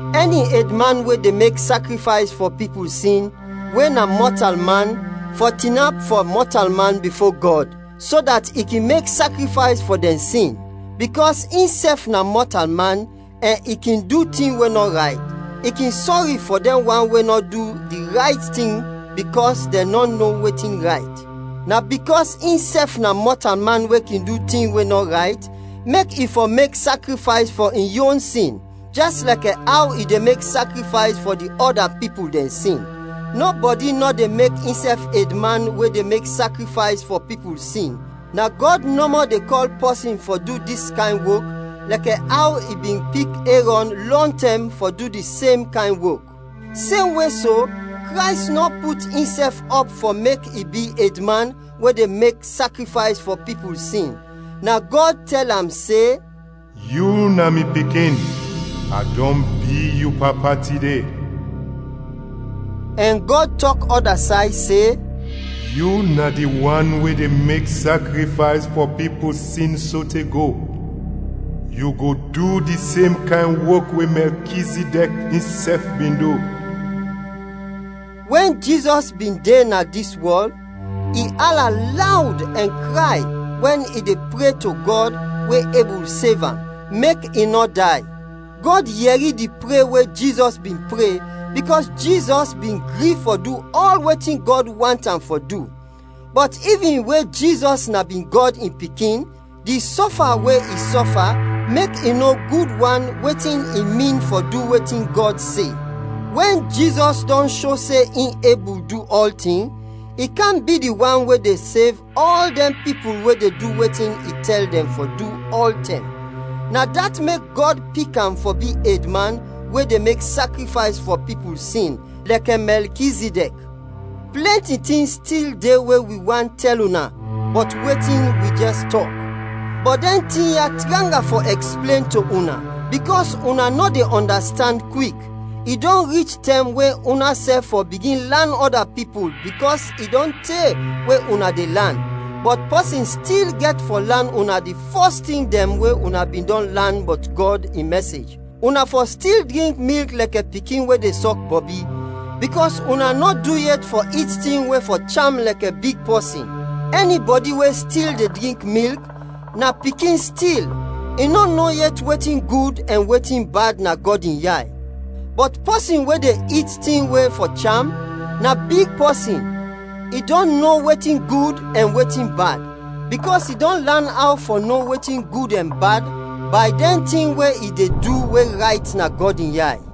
Ɛni edman we de mek sakrifays fɔ pipul sin, we na mɔtalman, fɔ tinap fɔ mɔtalman bifo Gɔd, so dat i kin mek sakrifays fɔ dɛn sin. Bikɔs insɛf na mɔtalman ɛn i kin du tin we nɔ rayt, i kin sɔri fɔ dɛn wan we nɔ du di rayt tin bikɔs dɛn nɔ no wetin rayt. Na bikɔs insɛf na mɔtalman we kin du tin we nɔ rayt, mek i fɔ mek sakrifays fɔ in yon sin, jɛs lɛkɛ aw i de mek sakrifays fɔ di ɔda pipul dɛn sin. Nɔbɔdi nɔ de mek insɛf edman we de mek sakrifays fɔ pipul sin, na Gɔd nɔmɔ de kɔl pɔsin fɔ du dis kayn wok lɛkɛ aw i bin pik Erɔn lɔntɛm fɔ du di sem kayn wok. Semwe so, Krays nɔ put insɛf ɔp fɔ mek i bi edman we de mek sakrifays fɔ pipul sin, na Gɔd tɛl am se, “Yu na mi Pikin, a dɔn bi yu Papa tide.” Ɛn Gɔd tɔk ɔda say se, “Yu na di wan we de mek sakrifays fɔ pipul sin sote go, yu go du di sem kayn wok we Mɛlkizidɛk insɛf bin du.” Wɛn Jizɔs bin de na dis wɔl, i ala lawd ɛn kray wɛn i de pre to Gɔd we ebul sev am, mek i nɔ day. Gɔd yɛri di pre we Jizɔs bin pre bikɔs Jizɔs bin gri fɔ du ɔl wetin Gɔd want am fɔ du. Bɔt ivin we Jizɔs na bin Gɔd in Pikin, di sɔfa we i sɔfa mek i no gud wan wetin i min fɔ du wetin Gɔd se. Wɛn Jizɔs dɔn sho se in ebul du ɔltin, i kam bi di wan we de sev ɔl dɛn pipul we de du wetin i tɛl dɛn fɔ du, ɔltɛm. Na dat mek Gɔd pik am fɔ bi edman we de mek sakrifays fɔ pipul sin, lɛkɛ Mɛlkizidɛk. Plɛnti tin stil de we wi want tɛl una bɔt wetin wi jɛs tɔk, bɔt dɛn tin ya tranga fɔ ɛksplen to una, bikɔs una nɔ de ɔndastand kwik. I dɔn rich tɛm we unasɛf fɔ bigin lan ɔda pipul bikɔs i dɔn te we una de lan, bɔt pɔsin stil gɛt fɔ lan una di fɔs tin dɛn we una bin dɔn lan bɔt Gɔd in mɛsej. Una fɔ stil drink milk lɛkɛ pikin we de sɔk bɔbi, bikɔs una nɔ du yet fɔ it tin we fɔ cham lɛkɛ big pɔsin. Ɛnibɔdi we stil de drink milk, na pikin stil, i nɔ no yet wetin gud ɛn wetin bad na Gɔd in yay. Bɔt pɔsin we de it tin we fɔ cham, na big pɔsin; i dɔn no wetin gud ɛn wetin bad, bikɔs i dɔn lan aw fɔ no wetin gud ɛn bad bay dɛn tin we i de du we rayt na Gɔd in yay.